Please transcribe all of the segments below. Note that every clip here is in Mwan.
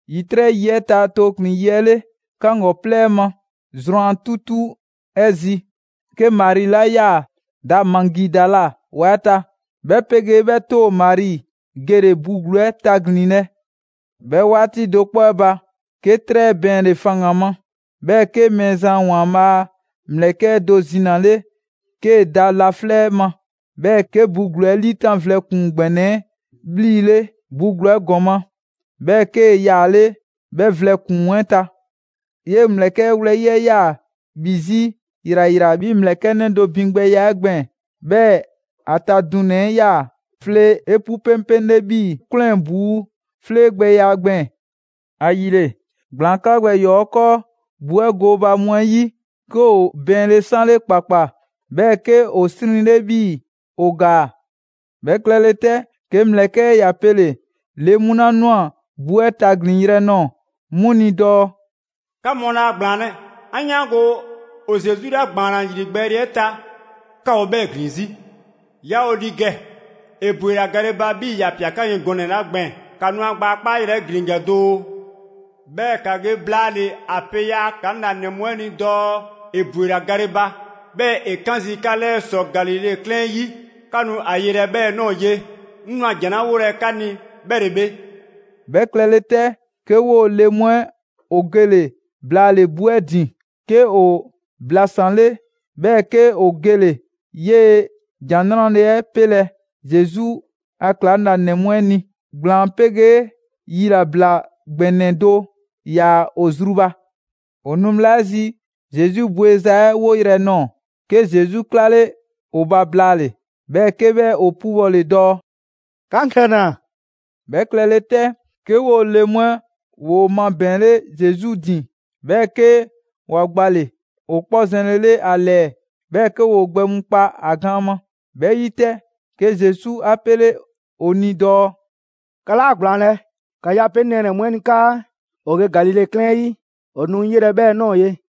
‑Yitrɛ' yi 'ɛ ta tooklin‑ yi 'ɛ 'le, 'kaŋgɔplɛ 'ɛ ma, zrwan 'tutu 'ɛ 'zi, 'ke Mari 'la 'yaa‑ da Magidala ‑wa 'ɛ ta, 'bhɛ 'pegee 'bhɛ 'too‑ Mari, gele‑ bu ‑gluu 'ɛ taglinlɛ. 'Bhɛ 'waati do 'kpɔ 'ɛ ba, 'ke 'trɛ bɛɛnle‑ faŋgan‑ ma, 'bhɛɛ‑ 'ke Mɛɛzan ‑Waanbhaa' a ‑mlɛkɛ' do zinale 'kee‑ da laflɛ' ma. 'Bhɛɛ‑ 'kee‑ bu ‑gluu 'ɛ 'liitan vlɛ ‑kpuŋ ‑gbɛnɛ 'ɛ 'bhlile‑ bu ‑gluu 'ɛ ‑gɔma', 'bhɛɛ‑ 'kee‑ yaale' 'bhɛ vlɛ ‑kpuŋ 'ɛ ta. 'Yee‑ ‑mlɛkɛ' 'ɛ wlɛyi' 'ɛ 'yaa‑ ‑bhi 'zi ‑yrayra 'bhii‑ mlɛklɛnnɛ do ‑bhigbɛya 'ɛ gbɛɛn‑, 'bhɛɛ‑ ‑a ta dunɛ‑ 'ɛ 'yaa‑ flee 'epu 'peŋpeŋle 'bhii‑ 'kwlɛn‑ ‑buu' 'fleegbɛya gbɛɛn‑. ‑Ayile, ‑gblaan 'kla gbɛ ‑yɔɔ 'ɛ 'kɔɔ bu 'ɛ gooba mu 'ɛ 'yi, 'ke ‑o bɛɛnle 'sanle ‑kpakpa, 'bhɛɛ‑ 'ke ‑o 'srinle 'bhii‑ ‑o ‑gaa. 'Bhɛ klɛle 'tɛ, 'ke ‑mlɛkɛ' 'ɛ ‑ya pele‑ le mu 'la ꞊nwa bu 'ɛ taglinyrɛ 'ɛ nɔɔ‑ 'mu ni dɔɔ: «'Ka mu laa ‑gblaanlɛ'! 'An 'yaango‑ ‑o Zesu 'la ‑gbaanna ‑yrigbɛɛle 'ɛ ta, 'ka ‑o 'bhɛɛ‑ ‑gliŋ 'zi. Yaa ‑o ‑li ‑gɛ. ‑E ‑bwela gale ba 'bhii‑ ‑ya ‑pia 'ka ni gɔnɛ‑ 'la gbɛɛn‑. ‑Ka nu ‑a gbaa 'kpayrɛ‑ 'ɛ ‑glin ‑gɛ doo. 'Bhɛɛ‑ ‑ka ge blaale‑ ‑a pe ‑yaa' ‑klaŋlanɛ mu 'ɛ ni dɔɔ ‑e ‑bwela gale ba, 'bhɛɛ‑ ‑e 'kan zii' 'ka 'lɛɛ ‑sɔ Galile 'klɛɛn 'ɛ 'yi. 'Ka nu ‑a yelɛ 'bhɛɛ‑ ꞊nɔɔ ye. 'Ŋ ꞊nwa ‑jan 'la 'wolɛ‑ 'ka ni 'bhɛ ‑le bhe.» 'Bhɛ klɛle 'tɛ, 'ke 'woo‑ le mu 'ɛ ‑o gole‑ blaale‑ bu 'ɛ ‑din, 'ke ‑o blasanle, 'bhɛɛ‑ 'ke ‑o gele‑ 'yee‑ ‑Jan 'Nrale‑ 'ɛ 'pelɛ‑ Zesu a ‑klaŋlanɛ mu 'ɛ ni. ‑Gblaan 'pegee yilabla ‑gbɛnɛ do ‑yaa ‑o zru ba. ‑O nu bhla 'ɛ zi, Zesu bewza 'ɛ 'woyrɛ‑ nɔɔ‑, 'ke Zesu 'klale ‑o ba blaale‑, 'bhɛɛ‑ 'ke 'bhɛ ‑o 'pubɔle dɔɔ: «'Ka 'ŋ ‑kɛna!» 'Bhɛ klɛle 'tɛ, 'ke 'woo‑ le mu 'ɛ ‑woo mabɛɛnle Zesu ‑din, 'bhɛɛ‑ 'ke ‑wa gbale‑ ‑o 'kpɔ zɛnlele ‑a ‑lɛɛ, 'bhɛɛ‑ 'ke ‑woo gbɛ mu kpa ‑a gaan ma. 'Bhɛ 'yi 'tɛ, 'ke Zesu 'a 'pele‑ ‑o ni dɔɔ: «'Ka 'laa ‑gblaanlɛ'! ‑Ka ge a pe 'ŋ nɛɛnɛ‑ mu 'ɛ ni 'kaa ‑o ge Galile 'klɛɛn 'yi: ‑O nu 'ŋ 'yelɛ‑ 'bhɛɛ‑ ꞊nɔɔ ye.»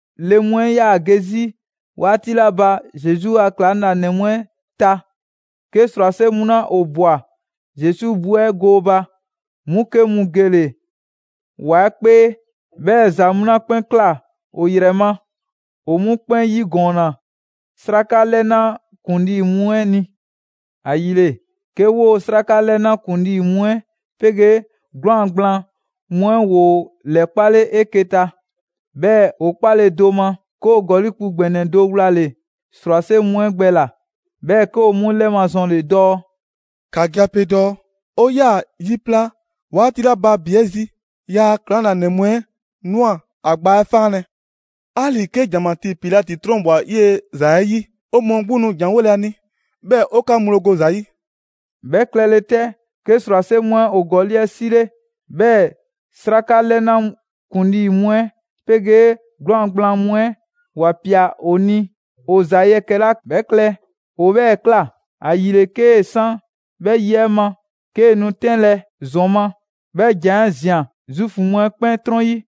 Le mu 'ɛ 'yaa‑ ge 'zi 'waati 'la ba Zesu a ‑klaŋlanɛ mu 'ɛ ta, 'ke ‑srwase' mu 'la ‑o ꞊bwa Zesu bu 'ɛ gooba, 'mu 'ke mu gele‑ ‑wa 'ɛ 'kpee, 'bhɛɛ‑ ‑za mu 'la 'kpɛn ꞊kla ‑o ‑yrɛ ma, ‑o 'mu 'kpɛn 'yigɔɔnna 'sraka 'lɛna ‑kuŋlii mu 'ɛ ni. ‑Ayile, 'ke 'woo‑ 'sraka 'lɛna ‑kuŋlii mu 'ɛ 'pegee 'gwlaan‑ gblaan mu 'ɛ ‑woo ‑lɛkpale 'eke‑ ta. 'Bhɛɛ‑ ‑o 'kpale do ma, 'ke ‑o ‑gɔli' kpu ‑gbɛnɛ do wlale‑ ‑srwase' mu 'ɛ gbɛ ꞊la. 'Bhɛɛ‑ 'ke ‑o 'mu 'lɛmazɔnle dɔɔ: «‑Ka ge ‑a pe dɔɔ 'o 'yaa‑ yi pla 'waati 'la ba ‑bi 'ɛ zi, ‑yaa' ‑klaŋlanɛ mu 'ɛ ꞊nwa ‑a gbaa 'ɛ faanlɛ‑. 'Ali‑ 'ke ‑janmatii Pilati 'trɔnbwa‑ 'yee‑ ‑za 'ɛ 'yi, 'o mɔɔ 'gbu nu ‑janwole a ni, 'bhɛɛ‑ 'o 'ka ŋgblo go ‑za 'yi.» 'Bhɛ klɛle 'tɛ, 'ke ‑srwase' mu 'ɛ ‑o ‑gɔli' 'ɛ 'sile, 'bhɛɛ‑ 'sraka 'lɛna ‑kuŋlii' mu 'ɛ 'pegee 'gwlaan‑ gblaan mu 'ɛ ‑wa ‑pia ‑o ni ‑o ‑za yɛkɛ‑ 'la 'bhɛ klɛ ‑o 'bhɛɛ‑ ꞊kla. ‑Ayile, 'kee‑ san 'bhɛ yi 'ɛ ma, 'kee‑ nu 'tɛnlɛ‑ ‑zɔn ma, 'bhɛ ‑jan 'ɛ ꞊zian Zuufu mu 'ɛ 'kpɛn 'trɔn 'yi.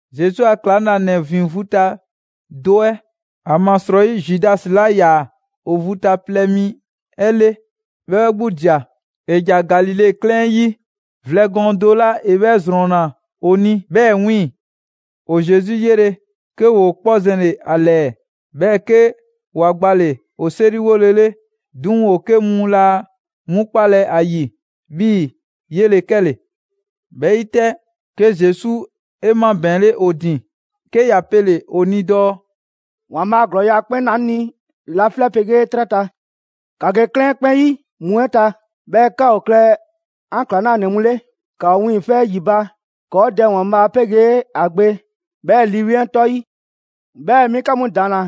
Zesu a ‑klaŋlanɛ ‑vin vu ta do 'ɛ (‑amasrɔyi Zudasi 'la 'yaa‑ ‑o vu ta plɛ mi 'ɛ le, bhɛ 'bhɛ 'gbu ꞊dia) ‑ja Galile 'klɛɛn 'yi vlɛ gɔɔn do 'la ‑e 'bhɛ ‑zrɔnna ‑o ni 'bhɛɛ‑ 'wiiŋ‑. ‑O Zesu 'yele‑, 'ke ‑woo 'kpɔ zɛnle‑ ‑a ‑lɛɛ, 'bhɛɛ‑ 'ke ‑wa gbale‑ ‑o 'seriwolele. 'Duŋ‑ ‑o 'ke mu laa 'mu 'kpalɛ‑ ‑a ‑yi 'bhii‑ 'yele‑ 'kɛle‑. 'Bhɛ 'yi 'tɛ, 'ke Zesu 'e 'mabɛɛnle ‑o ‑din, 'ke ‑ya pele‑ ‑o ni dɔɔ: «‑Waanbhaa' ‑glɔɔya' 'kpɛn ꞊naa 'ŋ ni laflɛ' 'pegee 'trɛ ta. ‑Ka ge 'klɛɛn 'kpɛn 'yi mu 'ɛ ta, 'bhɛɛ‑ ‑ka ‑o klɛ 'an ‑klaŋlanɛ mu 'le. ‑Ka ‑o wiiŋfɛ' ‑yi ba ‑kɔɔ' Dɛ ‑Waanbhaa' 'pegee ‑a Gbe, 'bhɛɛ‑ Lii 'Weŋ 'ɛ 'tɔ 'yi. 'Bhɛɛ‑ 'mi 'ka mu ‑daanna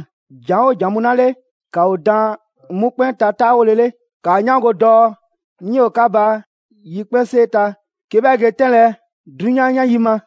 ‑jan 'oo ‑jan mu 'la 'le, ‑ka ‑o daan 'mu 'kpɛn ta 'taawolele. ‑Kaa 'yaango‑ dɔɔ 'ŋ 'yoo‑ 'ka ba yikpɛnsee ta, 'ke 'bhɛ ge 'tɛnlɛ‑ 'drunyan 'yan yi ma.»